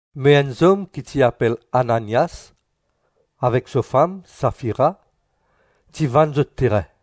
Me enn zom ki ti apel Ananias avek so fam Safira ti vann zot terin.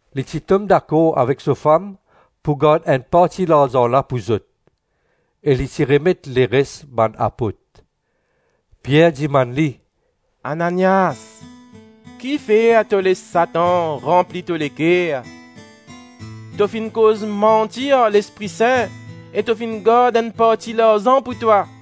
Li ti tom dakor avek so fam pou gard enn parti larzan la pou zot, e li ti remet leres bann apot. Pier dimann li, “Ananias, kifer to les Satan ranpli to leker? To finn koz manti ar Lespri Sin e to finn gard enn parti larzan pou twa.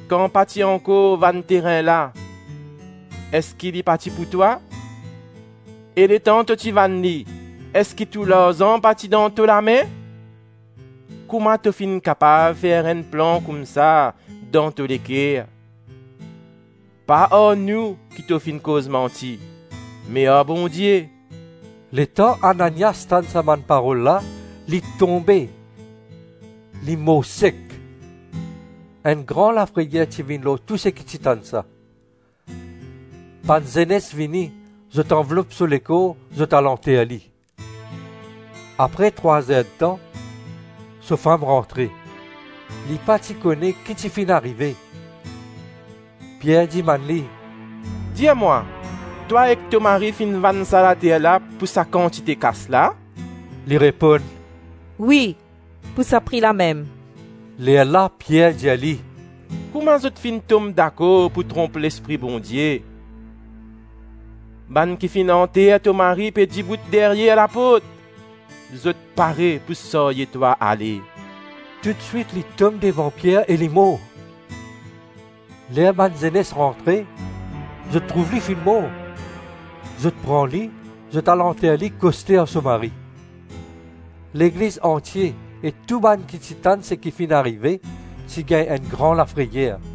Kan pa ti ankor vann terin la, eski li pa ti pou twa? E letan to ti vann li, eski tou larzan pa ti dan to lame? Kouma to finn kapav fer enn plan koumsa dan to leker? Pa ar nou ki to finn koz manti, me ar Bondie.” Letan Ananias tann sa bann parol la, li tonbe, li mor sek. Enn gran lafreyer ti vinn lor tou seki ti tann sa. Bann zenes vini, zot anvlop so lekor, zot al anter li. Apre trwa zer-tan, so fam rantre; li pa ti kone ki ti finn arive. Pier dimann li, “Dir mwa, twa ek to mari finn vann sa later la pou sa kantite kas la?” Li reponn, “Wi, pou sa pri la mem.” Lerla Pier dir li, “Kouma zot finn tom dakor pou tronp Lespri Bondie? Bann ki finn anter to mari pe dibout deryer laport, zot pare pou sarye twa ale.” Toutswit li tom devan Pier e li mor. Ler bann zenes rantre, zot trouv li finn mor. Zot pran li, zot al anter li koste ar so mari. Legliz antie e tou bann ki ti tann seki finn arive ti gagn enn gran lafreyer.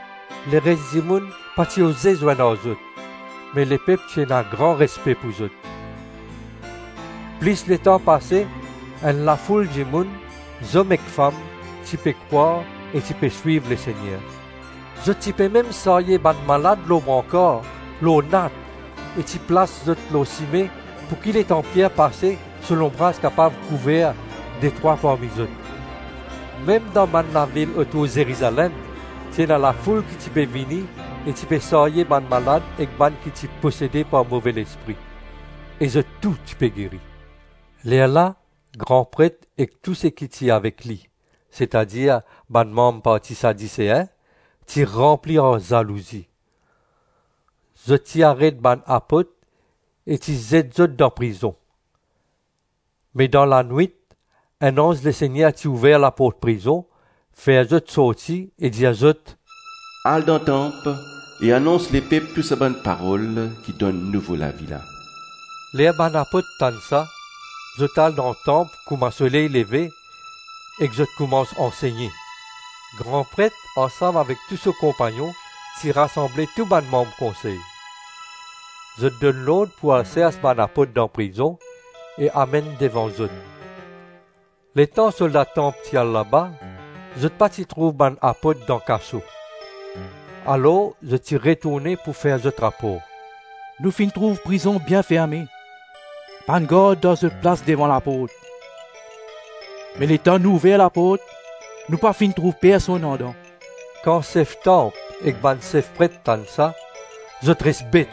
Leres dimoun pa ti oze zwenn ar zot, me lepep ti ena gran respe pou zot. Plis letan pase, enn lafoul dimoun, zom ek fam, ti pe krwar e ti pe swiv Lesegner. Zot ti pe mem sarye bann malad lor brankar, lor nat, e ti plas zot lor sime pouki letan Pier pase so lonbraz kapav kouver detrwa parmi zot. Mem dan bann lavil otour Zerizalem ti ena lafoul ki ti pe vini e ti pe sarye bann malad ek bann ki ti posede par move lespri, e zot tou ti pe geri. Lerla gran pret ek tou seki ti avek li, setadir bann manm parti Sadisein, ti ranpli ar zalouzi. Zot ti aret bann apot e ti zet zot dan prizon. Me dan lanwit enn anz Lesegner ti ouver laport prizon, fer zot sorti e dir zot, “Al dan tanp e anons lepep tou sa bann parol ki donn nouvo lavi la.” Ler bann apot tann sa, zot al dan tanp kouma soley leve ek zot koumans ansegne. Gran pret ansam avek tou so konpagnon ti rasanble tou bann manm konsey. Zot donn lord pou al sers bann apot dan prizon, e amenn devan zot. Letan solda tanp ti al laba, zot pa ti trouv bann apot dan kaso. Alors zot ti retourne pou fer zot rapor: “Nou finn trouv prizon bien ferme, bann gard dan zot plas devan laport. Me letan nou ouver laport, nou pa finn trouv personn andan.” Kan sef tanp ek bann sef pret tann sa, zot res bet,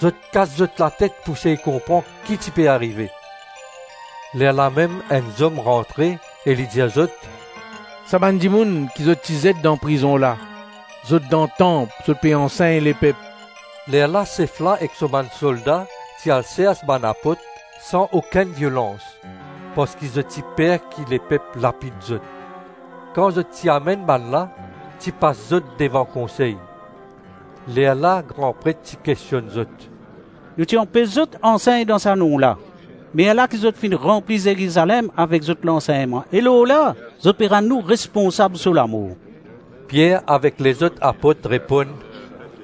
zot kas zot latet pou sey konpran ki ti pe arive. Lerlamem enn zom rantre e li dir zot, “Sa bann dimoun ki zot ti zet dan prizon la, zot dan tanp zot pe ansegn lepep.” Lerla sef la ek so bann solda ti al sers bann apot san okenn violans, parski zot ti per ki lepep lapid zot. Kan zot ti amenn bannla, ti pas zot devan konsey. Lerla gran pret ti kestionn zot. “Nou ti anpes zot ansegn dan sa nom la; me ala ki zot finn ranpli Zerizalem avek zot lansegnman; e lorla zot pe rann nou responsab so lamor!” Pier avek lezot apot reponn,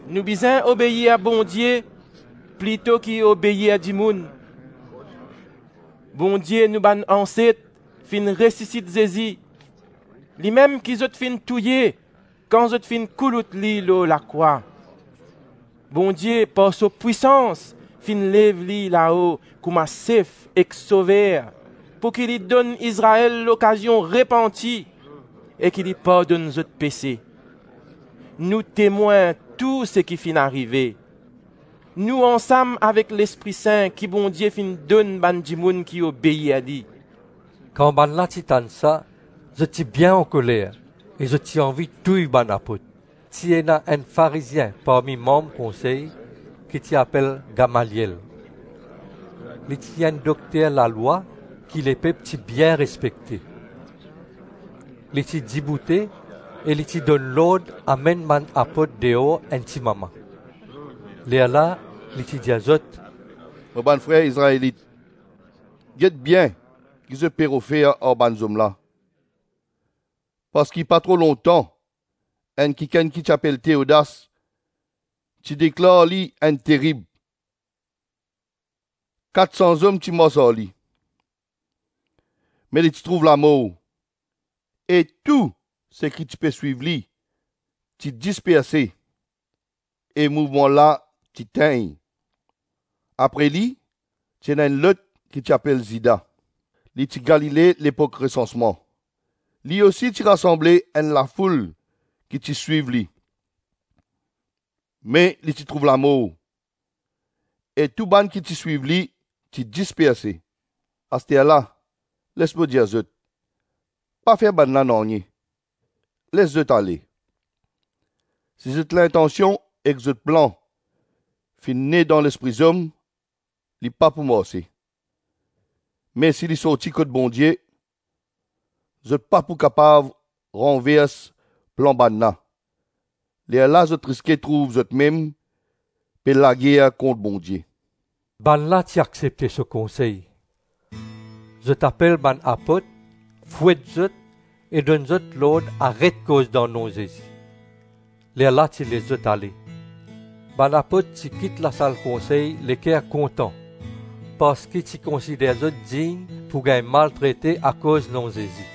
“Nou bizin obeir Bondie plito ki obeir dimoun. Bondie nou bann anset finn resisit Zezi, limem ki zot finn touye kan zot finn koulout li lor lakrwa. Bondie, par so pwisans, finn lev li lao kouma Sef ek Sover pouki li donn Izrael lokazion repanti, e ki li pardonn zot pese. Nou temwin tou seki finn arive, nou ansam avek Lespri Sin ki Bondie finn donn bann dimoun ki obeir li.” Kan bannla ti tann sa zot ti bien ankoler e zot ti anvi touy bann apot. Ti ena enn Farizien parmi manm konsey, ki ti apel Gamaliel. Li ti enn dokter lalwa ki lepep ti bien respekte. Li ti diboute e li ti donn lord amenn bann apot deor enn ti mama. Lerla li ti dir zot, “Mo bann frer Izraelit, get bien ki zot pe rod fer ar bann zom la. Parski pa tro lontan enn kikenn ki ti apel Teodas ti deklar li enn terib; kat san zom ti mars ar li. Me li ti trouv lamor, e tou seki ti pe swiv li ti disperse, e mouvman la ti tegn. Apre li, ti ena enn lot ki ti apel Zida. Li ti Galile, lepok resansman; li osi ti rasanble enn lafoul ki ti swiv li, me li ti trouv lamor, e tou bann ki ti swiv li ti disperse. Asterla, les mo dir zot, pa fer bannla nanye, les zot ale. Si zot lintansion ek zot plan finn ne dan lespri zom, li pa pou marse; me si li sorti kot Bondie, zot pa pou kapav ranvers plan bannla; lerla zot riske trouv zotmem pe lager kont Bondie!” Bannla ti aksepte so konsey. Zot apel bann apot, fwet zot, e donn zot lord aret koz dan nom Zezi; lerla ti les zot ale. Bann apot ti kit lasal konsey leker kontan parski ti konsider zot dign pou gagn maltrete akoz nom Zezi.